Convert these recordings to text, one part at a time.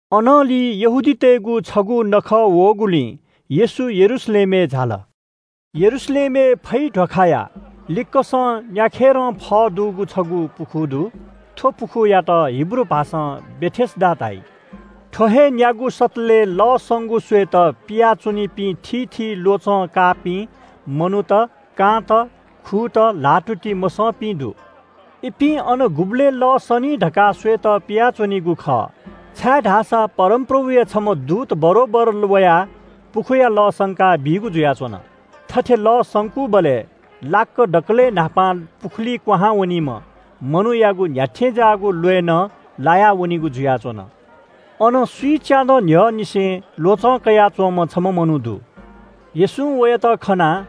अनंलि यहूदीतय्‌गु छगू नखः वःगुलिं येशू यरूशलेमय् झाल। यरूशलेमय् फै ध्‍वाखाया लिक्‍कसं न्‍याखेरं फः दुगु छगू पुखू दु। थ्‍व पुखूयात हिब्रू भाषां बेथेस्‍दा धाइ। थ्‍व हे न्‍यागू सतलय् लः संगु स्‍वय्‌त पिया च्‍वनीपिं थीथी ल्‍वचं काःपिं मनूत – कांत, खुत, ल्‍हाःतुति मसंपिं दु। इपिं अन गुबलय् लः सनी धकाः स्‍वयेत पियाच्‍वनीगु खः। छाय्‌धाःसा परमप्रभुया छम्‍ह दूत बरोबर वयाः पुखूया लः संकाबीगु जुयाच्‍वन। थथे लः संकूबलय् लाक्‍क दकलय् न्‍हापां पुखुलिइ कुहां वनीम्‍ह मनूयागु न्‍ह्याथें ज्‍याःगु ल्‍वय् नं लायावनिगु जुयाच्‍वन। अन स्‍विच्‍यादँ न्‍ह्यःनिसें ल्‍वचं कयाच्‍वंम्‍ह छम्‍ह मनू दु। येशूं वयात खनाः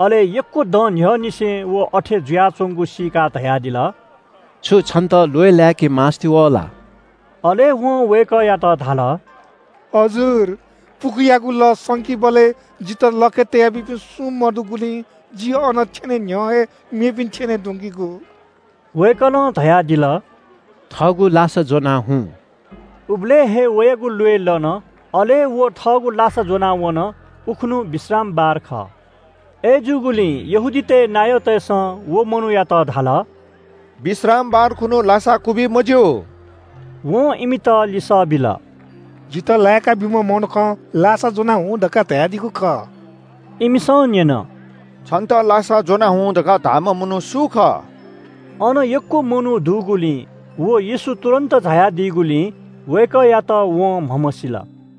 अले यक्‍व दँ न्‍ह्यःनिसें व अथे जुयाच्‍वंगु सीकाः धयादिल – “छु छन्‍त ल्‍वय् लाय्‌के मास्‍ति वः ला?” अले वं वय्‌कःयात धाल – “हजुर, पुखूयागु लः संकीबलय् जितः लखय् तया बीपिं सुं मदुगुलिं जि अन थ्‍यने न्‍ह्यः हे मेपिं थ्‍यनेधुंकीगु।” वय्‌कलं धयादिल – “थःगु लासा ज्‍वनाः न्‍यासि हुँ।” उबलय् हे वयागु ल्‍वय् लन। अले व थःगु लासा ज्‍वनाः न्‍यासि जुल। उखुन्‍हु विश्रामबार खः। अय्‌जूगुलिं यहूदीतय् नायःतय्‌सं व मनूयात धाल – “विश्रामबार खुन्‍हु लासा क्‍वबी मज्‍यू।” वं इमित लिसः बिल – “जितः लाय्‌का ब्‍यूम्‍ह मनुखं ‘लासा ज्‍वनाः हुँ’ धकाः धयादीगु खः।” इमिसं न्‍यन – “छन्‍त लासा ज्‍वनाः हुँ धकाः धाःम्‍ह मनू सु खः?” अन यक्‍व मनू दुगुलिं व येशू तुरुन्‍त झायादीगुलिं वय्‌कःयात वं म्‍हमसील।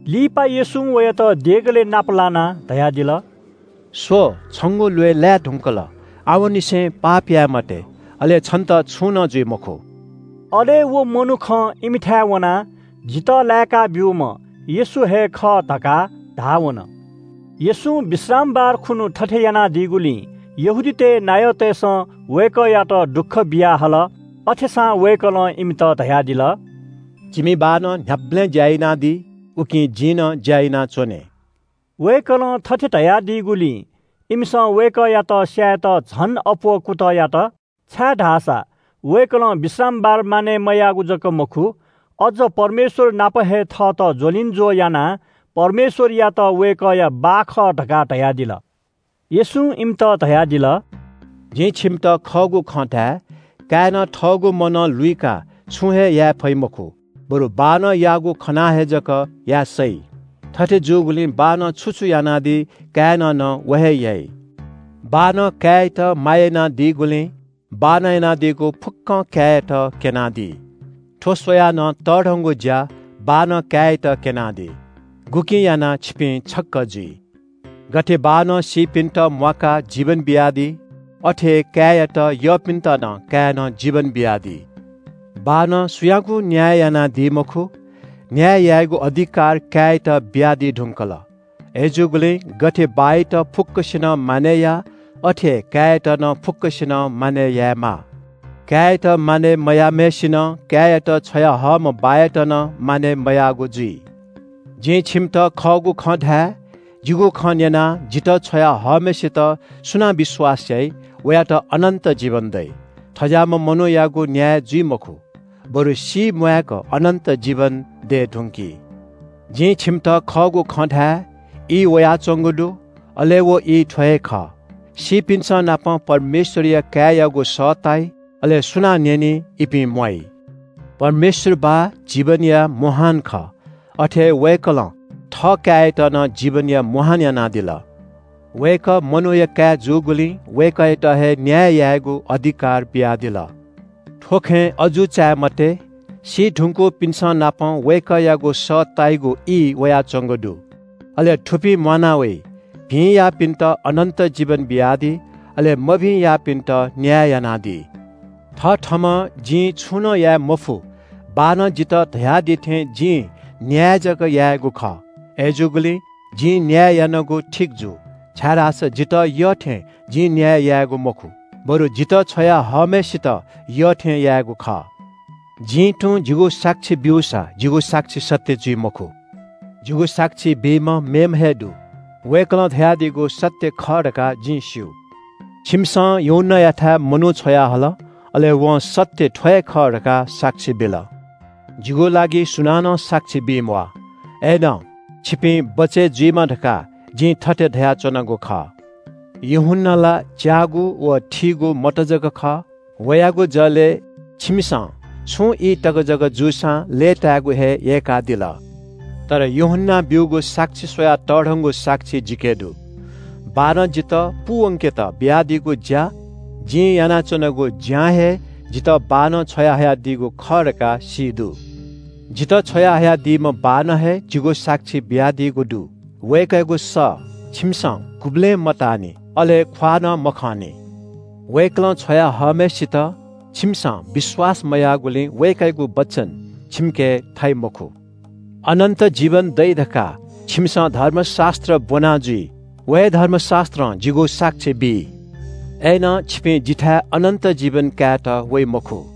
लिपा येशूं वयात देगलय् नाप लानाः धयादिल – “स्‍व, छंगु ल्‍वय् लाये धुंकल। आवंनिसें पाप याये मते, अले छन्‍त छुं नं जुइ मखु।” अले व मनुखं इमिथाय् वनाः “जितः लायेका ब्‍यूम्‍ह येशू हे खः” धकाः धाः वन। येशूं विश्रामबार खुन्‍हु थथे यानादीगुलिं यहूदीतय् नायःतय्‌सं वय्‌कःयात दुःख बियाहल। अथेसां वय्‌कलं इमित धयादिल – “जिमि बाःनं न्‍ह्याबलें ज्‍या यानादी, उकिं जिं नं ज्‍या यानाच्‍वने।” वय्‌कलं थथे धयादीगुलिं इमिसं वय्‌कःयात स्‍यायेत झन अप्‍वः कुतः यात। छाय्‌धाःसा वय्‌कलं विश्रामबार मानय् मयाःगु जक मखु, अज्‍ज परमेश्‍वर नाप हे थःत ज्‍वलिंज्‍वः यानाः परमेश्‍वरयात वय्‌कःया बाः खः धकाः धयादिल। येशूं इमित धयादिल – “जिं छिमित खःगु खँ धाये – काय्‌नं थःगु मनं लुइकाः छुं हे याये फइ मखु, बरु बाःनं याःगु खनाः हे जक याये सइ। थथे जूगुलिं बाःनं छु छु यानादी, काय्‌नं नं व हे याइ। बाःनं काय्‌यात माया यानादीगुलिं बाःनं यानादीगु फुक्‍कं काय्‌यात क्‍यनादी। थ्‍व स्‍वयाः नं तःधंगु ज्‍या बाःनं काय्‌यात क्‍यनादी, गुकिं यानाः छिपिं छक्‍क जुइ। गथे बाःनं सीपिन्‍त म्‍वाकाः जीवन बियादी, अथे हे काय्‌यात यःपिन्‍त नं काय्‌नं जीवन बियादी। बाःनं सुयागुं न्‍याय यानादी मखु। न्‍याय यायेगु अधिकार काय्‌यात बियादी धुंकल। अय्‌जूगुलिं गथे बाःयात फुक्‍कसिनं मानय् याः अथे हे काय्‌यात नं फुक्‍कसिनं मानय् यायेमाः। काय्‌यात मानय् मयाःम्‍हय्‌सिनं काय्‌यात छ्वयाहःम्‍ह बाःयात नं मानय् मयाःगु जुइ। “जिं छिमित खःगु खँ धाये – जिगु खँ न्‍यनाः जितः छ्वया हःम्‍हय्‌सित सुनां विश्‍वास याइ, वयात अनन्‍त जीवन दइ। थज्‍याःम्‍ह मनूयागु न्‍याय जुइ मखु, बरु सीम्‍वाय्‌क अनन्‍त जीवन दये धुंकी।” “जिं छिमित खःगु खँ धाये – ई वयाच्‍वंगु दु, अले व ई थ्‍व हे खः – सीपिन्‍संनापं परमेश्‍वरया काय्‌यागु सः ताइ, अले सुनां न्‍यनी, इपिं म्‍वाइ। परमेश्‍वर बाः जीवनया मुहान खः, अथे हे वय्‌कलं थःकाय्‌यात नं जीवनया मुहान यानादिल। वय्‌कः मनूया काय् जूगुलिं वय्‌कःयात हे न्‍याय यायेगु अधिकार बियादिल। थ्‍व खँय् अजू चाये मते, सी धुंकूपिन्‍संनापं वय्‌कःयागु सः ताइगु ई वयाच्‍वंगु दु। अले थुपिं म्‍वाना वइ। भिं याःपिन्‍त अनन्‍त जीवन बियादी। अले मभिं याःपिन्‍त न्‍याय यानादी।” “थथःम्‍हं जिं छुं नं याये मफु, बाःनं जितः धयादी थें जिं न्‍याय जक यायेगु खः। अय्‌जूगुलिं जिं न्‍याय यानागु ठीक जू, छाय्‌धाःसा जितः यःथें जिं न्‍याय यायेगु मखु, बरु जितः छ्वया हःम्‍हय्‌सित यःथें यायेगु खः।” “जिं तुं जिगु साक्षी ब्‍यूसा जिगु साक्षी सत्‍य जुइ मखु। जिगु साक्षी बीम्‍ह मेम्‍ह हे दु, वय्‌कलं धयादीगु सत्‍य खः धकाः जिं स्‍यू। छिमिसं यूहन्‍नायाथाय् मनू छ्वयाहल, अले वं ‘सत्‍य थ्‍व हे खः’ धकाः साक्षी बिल। जिगु लागि सुनानं साक्षी बी म्‍वाः। अय्‌नं छिपिं बचय् जुइमा धकाः जिं थथे धयाच्‍वनागु खः। यूहन्‍ना ला च्‍याःगु व थीगु मत जक खः। वयागु जलय् छिमिसं छुं ई तक जक जूसां लय्‌ताय्‌गु हे यय्‌कल। तर यूहन्‍नां ब्‍यूगु साक्षी स्‍वयाः तःधंगु साक्षी जिके दु। बाःनं जितः पूवंकेत बियादीगु ज्‍या व जिं यानाच्‍वनागु ज्‍यां हे जितः बाःनं छ्वयाहयादीगु खः धकाः सी दु। जितः छ्वयाहयादीम्‍ह बाःनं हे जिगु साक्षी बियादीगु दु। वय्‌कःयागु सः छिमिसं गुबलें मताःनि, अले ख्‍वाः नं मखंनि। वय्‌कलं छ्वया हःम्‍हय्‌सित छिमिसं विश्‍वास मयाःगुलिं वय्‌कःयागु वचन छिमिके थाइ मखु। “अनन्‍त जीवन दइ धकाः छिमिसं धर्मशास्‍त्र ब्‍वना जुइ। व हे धर्मशास्‍त्रं जिगु साक्षी बी, अय्‌नं छिपिं जिथाय् अनन्‍त जीवन कायेत वइ मखु।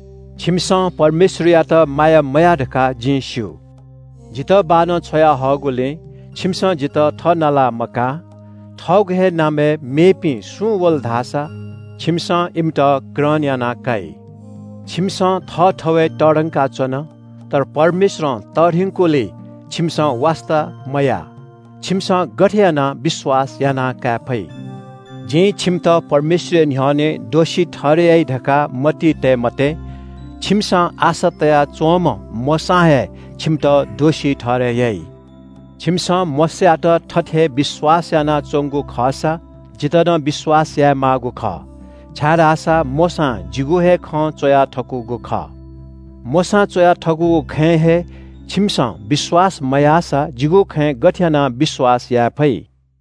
छिमिसं परमेश्‍वरयात माया मयाः धकाः जिं स्‍यू। जितः बाःनं छ्वयाहःगुलिं छिमिसं जितः थः नाला मकाः। थःगु हे नामय् मेपिं सुं वल धाःसा छिमिसं इमित ग्रहण याना काइ। छिमिसं थःथवय् तःधंका च्‍वन, तर परमेश्‍वरं तःधंकीगुलिइ छिमिसं वास्‍ता मया। छिमिसं गथे यानाः विश्‍वास याये फइ? “जिं छिमित परमेश्‍वरया न्‍ह्यःने दोषी ठहरय् याइ धकाः मतिइ तये मते। छिमिसं आशा तयाच्‍वंम्‍ह मोशां हे छिमित दोषी ठहरय् याइ। छिमिसं मोशायात धात्‍थें हे विश्‍वास यानाच्‍वंगु खःसा जितः नं विश्‍वास यायेमाःगु खः। छाय्‌धाःसा मोशां जिगु हे खँ च्‍वया थकूगु खः। मोशां च्‍वया थकूगु खँय् हे छिमिसं विश्‍वास मयासा जिगु खँय् गथे यानाः विश्‍वास याये फइ?”